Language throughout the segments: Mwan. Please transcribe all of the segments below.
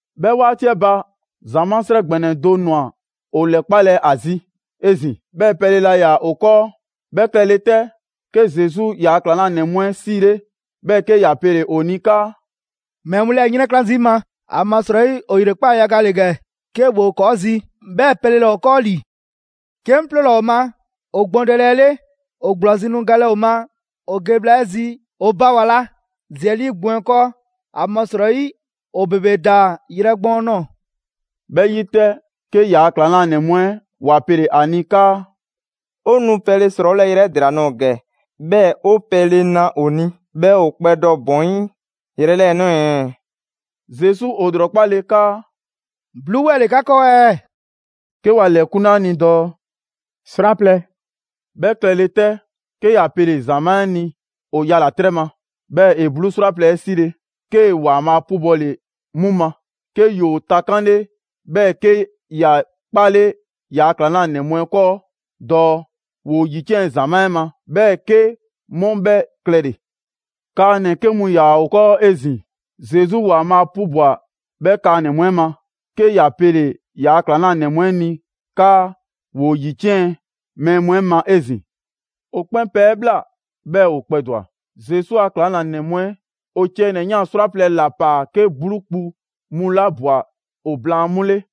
'Bhɛ 'waati 'ɛ ba, ‑zamaa' 'srɛ ‑gbɛnɛ do ‑nwa ‑o ‑lɛkpalɛ ‑a zi 'ezin‑. 'Bhɛɛ‑ pɛle laa ‑yaa ‑o 'kɔɔ. 'Bhɛ klɛle 'tɛ, 'ke Zesu ‑yaa' ‑klaŋlanɛ mu 'ɛ 'siile, 'bhɛɛ‑ 'ke ‑ya pele‑ ‑o ni 'kaa: «Mɛɛ mu 'lɛɛ‑ ‑yrɛnkla' zii' 'ŋ ma, ‑amasrɔyi ‑o ‑yrekpaa' yaga ‑le ‑gɛ 'ke ‑woo ‑kɔɔ' zi, 'bhɛɛ‑ pɛle laa ‑o 'kɔɔ ‑li. 'Ke 'ŋ 'ploola‑ ‑o ma ‑o gbɔndɛle 'ɛ 'le, ‑o ‑gblɔzi' nu galɛ ‑o ma ‑o ge bhla 'ɛ zi ‑o ba ‑wa la zi 'ɛ 'lii gbɔn 'ɛ 'kɔɔ. ‑Amasrɔyi ‑o ‑bebe ‑daa yrɛ gbɔɔn nɔɔ‑.» 'Bhɛ 'yi 'tɛ, 'ke ‑yaa' ‑klaŋlanɛ mu 'ɛ ‑wa pele‑ ‑a ni 'kaa: «'O nu pɛle ‑srɔɔwolɛ yrɛ 'ɛ ‑dela nɔɔ‑ ‑gɛ, 'bhɛɛ‑ 'o pɛle na ‑o ni, 'bhɛɛ‑ ‑o kpɛdɔ ‑bɔn 'yi yrɛ 'lɛɛ‑ ꞊nɔɔ ɛɛ?» Zesu ‑o ‑lrɔkpale 'kaa: «'bluu 'wɛɛ‑ ‑le 'ka 'kɔɔ ɛɛ?» 'Ke ‑wa ‑lɛkunle a ni dɔɔ: «'Srwaplɛ‑.» 'Bhɛ klɛle 'tɛ, 'ke ‑ya pele‑ ‑zamaa' 'ɛ ni ‑o yala‑ 'trɛ ma. 'Bhɛɛ‑ ‑e 'bluu 'srwaplɛ‑ 'ɛ 'sile‑, 'kee‑ ‑Waanbhaa' 'pubɔle 'mu ma, 'ke ‑yoo takanle 'bhɛɛ‑ 'ke ‑ya 'kpale ‑yaa' ‑klaŋlanɛ mu 'ɛ 'kɔɔ dɔɔ ‑woo ‑yiciɛn' ‑zamaa' 'ɛ ma. 'Bhɛɛ‑ 'ke 'mu 'bhɛ klɛle‑. Kaanɛ‑ 'ke mu ‑yaa ‑o 'kɔɔ 'ezin‑. Zesu ‑Waanbhaa' 'pubwa‑ 'bhɛ kaanɛ‑ mu 'ɛ ma, 'ke ‑ya pele‑ ‑yaa' ‑klaŋlanɛ mu 'ɛ ni 'kaa ‑woo ‑yiciɛn' mɛɛ mu 'ɛ ma 'ezin‑. ‑O 'kpɛn pɛ 'ɛ ꞊bhla, 'bhɛɛ‑ ‑o kpɛdwa‑. Zesu a ‑klaŋlanɛ mu 'ɛ ‑o ciɛ ‑nɛ ꞊yan 'srwaplɛ‑ ‑la ‑paa 'ke 'bluu kpu mu 'la ꞊bwa ‑o blaan 'mu 'le.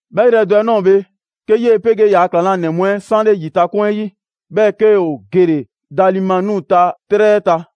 'Bhɛ yrɛ do 'ɛ ꞊nɔɔ bhe, 'ke 'yee‑ 'pegee ‑yaa ‑klaŋlanɛ mu 'ɛ 'sanle ‑yitakoŋ 'ɛ 'yi, 'bhɛɛ‑ 'ke ‑o gele‑ Dalimanuta 'trɛ 'ɛ ta.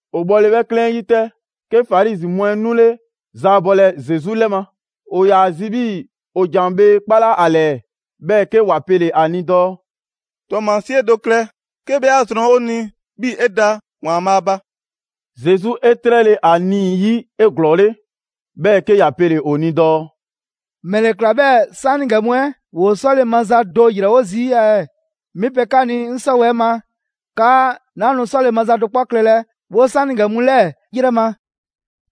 ‑O bhɔle 'bhɛ 'klɛɛn 'ɛ 'yi 'tɛ, 'ke Farizi mu 'ɛ 'nule‑ zaabɔlɛ Zesu 'lɛ ma. ‑O ‑yaa ‑a zi 'bhii‑ ‑o ‑jan bhee 'kpala ‑a ‑lɛɛ, 'bhɛɛ‑ 'ke ‑wa pele‑ ‑a ni dɔɔ: «‑Tɔɔmasie do klɛ 'ke 'bhɛ 'a zrɔn 'o ni 'bhii‑ 'e da ‑Waanbhaa' ba.» Zesu 'e 'trɛle ‑a nii‑ 'yi 'eglɔɔle, 'bhɛɛ‑ 'ke ‑ya pele‑ ‑o ni dɔɔ: «‑Mɛle ꞊kla 'bhɛɛ‑ 'saanigɛ mu 'ɛ ‑woo 'sɔle‑ maza do ‑yrɛ wo zii' ɛɛ? 'Mi pe 'ka ni 'ŋ 'sɔwɛɛ‑ ma 'kaa 'naa nu 'sɔle‑ maza do 'kpɔ klɛlɛ 'woo‑ 'saanigɛ mu 'lɛɛ‑ ‑yrɛ ma!»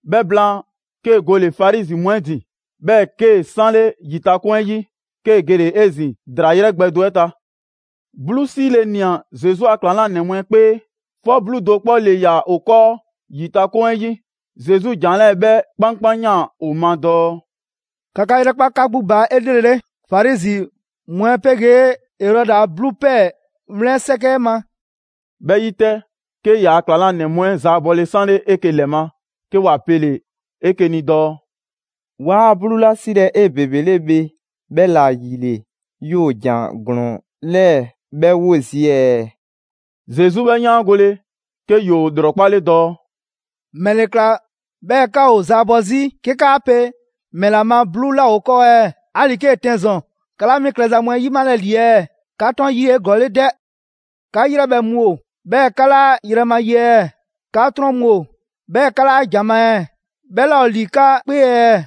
'Bhɛ blaan, 'kee‑ gole‑ Farizi mu 'ɛ ‑din, 'bhɛɛ‑ 'kee‑ 'sanle ‑yitakoŋ 'ɛ 'yi, 'kee‑ gele‑ 'ezin‑ ‑draa ‑yrɛ gbɛ do 'ɛ ta. 'Bluu 'sile‑ ꞊nia Zesu a ‑klaŋlanɛ mu 'ɛ 'kpee, 'fɔ 'bluu do 'kpɔ ‑le ‑yaa ‑o 'kɔɔ ‑yitakoŋ 'ɛ 'yi. Zesu ‑jan 'lɛɛ‑ 'bhɛ 'kpankpanyaan ‑o ma dɔɔ: «‑Ka 'ka 'yrɛkpa 'ka 'gbu ba 'elrele, Farizi mu 'ɛ 'pegee Erɔdi a 'bluu ‑pɛɛ 'wlɛn 'sɛkɛ 'ɛ ma.» 'Bhɛ 'yi 'tɛ, 'ke ‑yaa' ‑klaŋlanɛ mu 'ɛ ‑zaabɔle 'sanle 'eke‑ ‑lɛ ma 'ke ‑wa pele‑ 'eke‑ ni dɔɔ: «'Waa 'bluu 'la 'silɛ‑ 'ebebele bhe, 'bhɛla‑ ‑yile ‑yoo ‑jan ‑glɔɔn 'lɛɛ‑ 'bhɛ 'wo zii' ɛɛ?» Zesu 'bhɛ yaangole, 'ke ‑yoo ‑lrɔkpale dɔɔ: «‑Mɛle ꞊kla 'bhɛɛ‑ 'ka ‑o zaabɔ 'zi 'ke 'kaa pe ‑mɛla ma 'bluu 'laa ‑o 'o 'kɔɔ ɛɛ? 'Ali‑ 'kee‑ 'tɛn ‑zɔn, 'ka 'laa 'mi klɛza mu 'ɛ 'yimalɛ ‑li ɛɛ? 'Ka 'trɔn 'yi 'eglɔɔle 'dɛ? 'Ka 'yrɛbhɛ‑ mu ‑o, 'bhɛɛ‑ 'ka 'laa ‑yrɛ ma ye ɛɛ? 'Ka 'trɔn mu ‑o, 'bhɛɛ‑ 'ka 'laa ‑jan ma ɛɛ? 'Bhɛ 'laa ‑o ‑li 'ka 'kpee ɛɛ?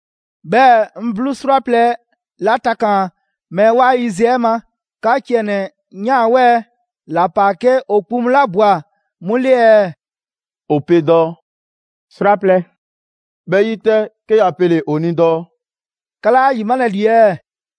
«'Bhɛɛ‑ 'ŋ 'bluu 'srwaplɛ‑ 'la takaan‑ mɛɛ 'waa yiziɛ 'ɛ ma, 'ka ciɛ ‑nɛ ꞊yan 'wɛɛ‑ ‑la ‑paa 'ke ‑o kpu mu 'la ꞊bwa 'mu 'le ɛɛ?» ‑O pe dɔɔ: «'Srwaplɛ‑.» 'Bhɛ 'yi 'tɛ, 'ke ‑ya pele‑ ‑o ni dɔɔ: «'Ka 'laa ‑a 'yimalɛ ‑li ɛɛ?»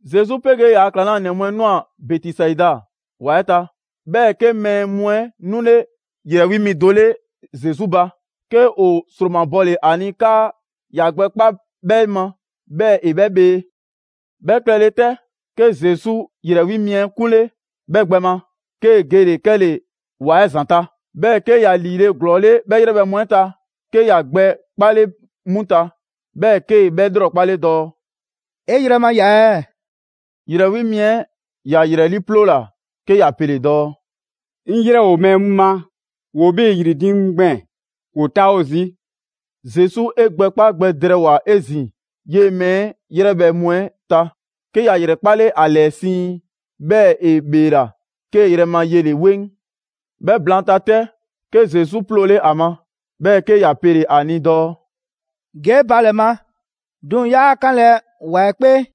Zesu 'pegee ‑yaa' ‑klaŋlanɛ mu 'ɛ ꞊nwa Bɛtisaida ‑wa 'ɛ ta. 'Bhɛɛ‑ 'ke mɛɛ mu 'ɛ 'nule ‑yrɛ 'wi mi do 'le Zesu ba, 'ke ‑o ‑sromabɔle ‑a ni 'kaa ‑ya gbɛ 'kpa 'bhɛ ma, 'bhɛɛ‑ ‑e 'bhɛ bhee. 'Bhɛ klɛ le 'tɛ, 'ke Zesu ‑yrɛ 'wi mi 'ɛ 'kunle‑ 'bhɛ gbɛ ma, 'kee‑ gele‑ 'kɛle‑ ‑wa 'ɛ ‑zanta'. 'Bhɛɛ‑ 'ke ‑ya ‑liile' ‑glɔɔle' 'bhɛ 'yrɛbhɛ‑ mu 'ɛ ta, 'ke ‑ya gbɛ 'kpale 'mu ta, 'bhɛɛ‑ 'kee‑ 'bhɛ ‑lrɔkpale dɔɔ: «'E yrɛ ma ya ɛɛ?» ‑Yrɛ 'wi mi 'ɛ ‑ya ‑yrɛ 'liiploola 'ke ‑ya pele‑ dɔɔ: «'Ŋ 'yrɛ ‑o mɛɛ mu ma, ‑woo 'bhii‑ ‑yri diiŋ mu gbɛɛn‑, ‑woo 'taawo zii'.» Zesu 'e gbɛ 'kpa gbɛ drɛɛwoa‑ 'ezin‑ 'yee‑ mɛɛ 'ɛ 'yrɛbhɛ‑ mu 'ɛ ta. 'Ke ‑ya ‑yrɛkpale ‑a ‑lɛɛ siiŋ, 'bhɛɛ‑ ‑e ‑bheela, kee‑ yrɛ ma 'yele 'weŋ. 'Bhɛ blaanta 'tɛ, 'ke Zesu 'ploole ‑a ma, 'bhɛɛ‑ 'ke ‑ya pele‑ ‑a ni dɔɔ: «Ge 'e ba ‑lɛ ma, 'duŋ‑ 'yaa 'kanlɛ‑ ‑wa 'ɛ 'kpee.»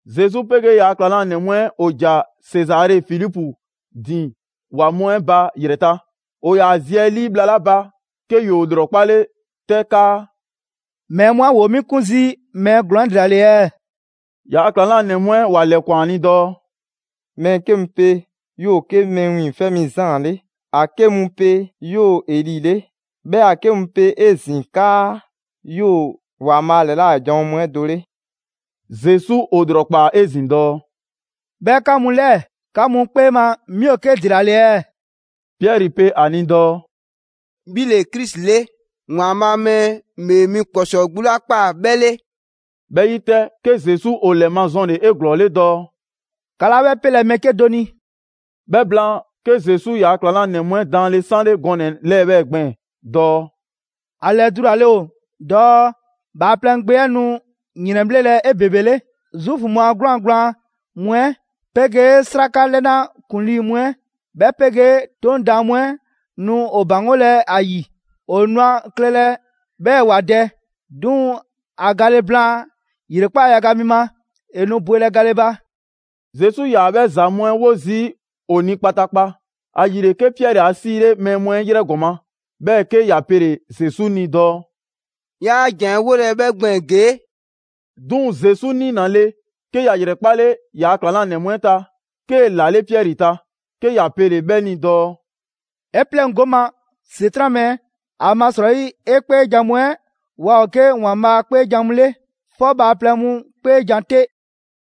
Zesu 'pegee ‑yaa' ‑klaŋlanɛ mu 'ɛ ‑o ‑ja Sezare Filipu ‑din ‑wa mu 'ɛ ba ‑yrɛ ta. ‑O ‑yaa zi 'ɛ 'lii bhla 'la ba, 'ke ‑yoo ‑lrɔkpale 'tɛ 'kaa: «Mɛɛ mu 'ɛ ‑woo 'mi 'kun zii' mɛɛ ‑glɔɔn 'ɛ ‑dela ‑le ɛɛ?» ‑Yaa' ‑klaŋlanɛ mu 'ɛ ‑wa ‑lɛkwan ‑a ni dɔɔ: «Mɛɛ 'ke mu pe 'yoo‑ 'ke Mɛɛ Wiiŋfɛ' Mi Zaan 'le, ‑a 'ke mu pe 'yoo‑ Eli 'le. 'Bhɛɛ‑ ‑a 'ke mu pe 'ezin‑ 'kaa 'yoo‑ ‑Waanbhaa' ‑lɛla' janwo mu 'ɛ do 'le.» Zesu ‑o ‑lrɔkpaa 'ezin‑ dɔɔ: «'Bhɛɛ‑ 'ka mu 'lɛɛ‑, 'ka mu 'kpee ma 'mi ‑o 'ke ‑dela ‑le ɛɛ?» Piɛri pe ‑a ni dɔɔ: «'Bhi ‑le Krisi 'le, ‑Waanbhaa' Mɛɛ ‑Bhee Mi ‑Kpɔsɔɔ 'gbu 'la ꞊kpaa 'bhɛ 'le.» 'Bhɛ 'yi 'tɛ, 'ke Zesu ‑o ‑lɛmazɔnle 'eglɔɔle dɔɔ: «'Ka 'laa 'bhɛ 'pelɛ‑ mɛɛ 'kedo‑ ni.» 'Bhɛ blaan, 'ke Zesu ‑yaa' ‑klaŋlanɛ mu 'ɛ daanle 'sanle gɔnɛ‑ 'lɛɛ‑ 'bhɛɛ‑ gbɛɛn‑ dɔɔ: «‑A ‑lɛdulale ‑o dɔɔ Bhaaplɛŋ Gbe 'ɛ nu ‑yrɛnbhlelɛ 'ebebele, Zuufu mu a 'gwlaan‑ gblaan mu 'ɛ, 'pegee'sraka 'lɛna ‑kuŋlii' mu 'ɛ, 'bhɛ 'pegee 'Toŋ daan mu 'ɛ nu ‑o ‑baŋgolɛ ‑a ‑yi. ‑O nu a klɛlɛ 'bhɛɛ‑ ‑wa dɛ, 'duŋ‑ ‑a gale blaan ‑yrekpaa' yaga mi ma, ‑e nu bwelɛ gale ba.» Zesu 'yaa‑ 'bhɛ ‑za mu 'ɛ 'wo zii' ‑o ni kpataakpa. ‑Ayile, 'ke Piɛri ‑a 'siile mɛɛ mu 'ɛ 'yrɛ ‑gɔma', 'bhɛɛ‑ 'ke ‑ya pele‑ Zesu ni dɔɔ: «'Yaa ‑janwolɛ 'bhɛ gbɛɛn‑ ‑gee'!» 'Duŋ‑ Zesu 'niinale 'ke ‑ya ‑yrɛkpale ‑yaa' ‑klaŋlanɛ mu 'ɛ ta, 'kee‑ ‑lale' Piɛri ta, 'ke ya pele‑ 'bhɛ ni dɔɔ: «'E 'pleŋgo 'ŋ ma, ‑Setran' mɛɛ! ‑Amasrɔyi 'e 'kpeejan‑ mu 'ɛ waa ‑o 'ke ‑Waanbhaa' 'kpeejan‑ mu 'le, 'fɔ bhaaplɛŋ mu 'kpeejan‑ 'te.»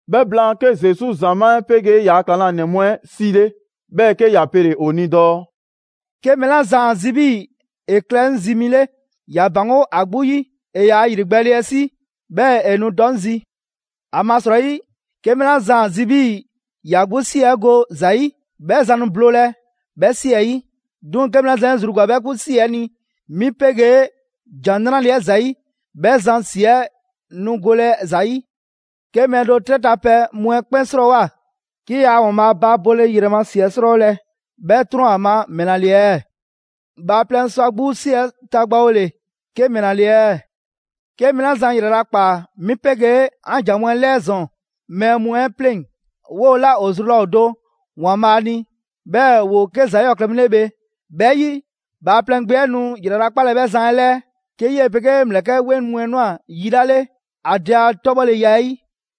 'Bhɛ blaan, 'ke Zesu ‑zamaa' 'ɛ 'pegee ‑yaa' ‑klaŋlanɛ mu 'ɛ 'siile, 'bhɛɛ‑ 'ke ‑ya pele‑ ‑o ni dɔɔ: «'Ke mɛɛ 'la zan ‑a zi 'bhii ‑e klɛ 'ŋ zi mi 'le, ‑ya ‑baŋgo' ‑a 'gbu 'yi, ‑e yaa ‑yrigbɛɛle 'ɛ 'si, 'bhɛɛ‑ ‑e nu dɔ 'ŋ zi. ‑Amasrɔyi, 'ke mɛɛ 'la zan ‑a zi 'bhii‑ ‑ya 'gbu ‑si 'ɛ go ‑za 'yi, 'bhɛ zan nu bloolɛ 'bhɛ 'si 'ɛ 'yi. 'Duŋ‑ 'ke mɛɛ la zan 'e zru ‑gwa 'bhɛ 'gbu 'si 'ɛ ni 'mi 'pegee ‑Jan 'Nrale‑ 'ɛ ‑zayi', 'bhɛ zan ‑si 'ɛ nu golɛ ‑za 'yi. 'Ke mɛɛ do 'trɛ ta pɛ mu 'ɛ 'kpɛn 'srɔɔwoa‑, 'ke yaa ‑Waanbhaa ba bole ‑yrɛ ‑si 'ɛ 'srɔɔwolɛ, 'bhɛ ‑trɔn ‑o ma ‑mɛla ‑le ɛɛ? Bhaaplɛŋ sɔ ‑a 'gbu 'si 'ɛ tagbawole 'ke ‑mɛla ‑le ɛɛ? 'Ke mɛɛ 'la zan ‑yralakpaa 'mi 'pegee 'an ‑jan mu 'ɛ 'lɛɛ ‑zɔn mɛɛ mu 'ɛ 'pleŋ‑, 'woo‑ 'la ‑o zru laa ‑o do ‑Waanbhaa' ni, 'bhɛɛ‑ ‑woo 'ke ‑za 'yɔɔ‑ klɛ mu 'le bhe. 'Bhɛ 'yi Bhaaplɛŋ Gbe 'ɛ nu yralakpalɛ 'bhɛ zan 'ɛ ‑lɛɛ, 'ke 'yee‑ 'pegee ‑mlɛkɛ' 'weŋ mu 'ɛ ꞊nwa yi 'la 'le ‑a Dɛ a 'tɔbhɔleya 'ɛ 'yi.»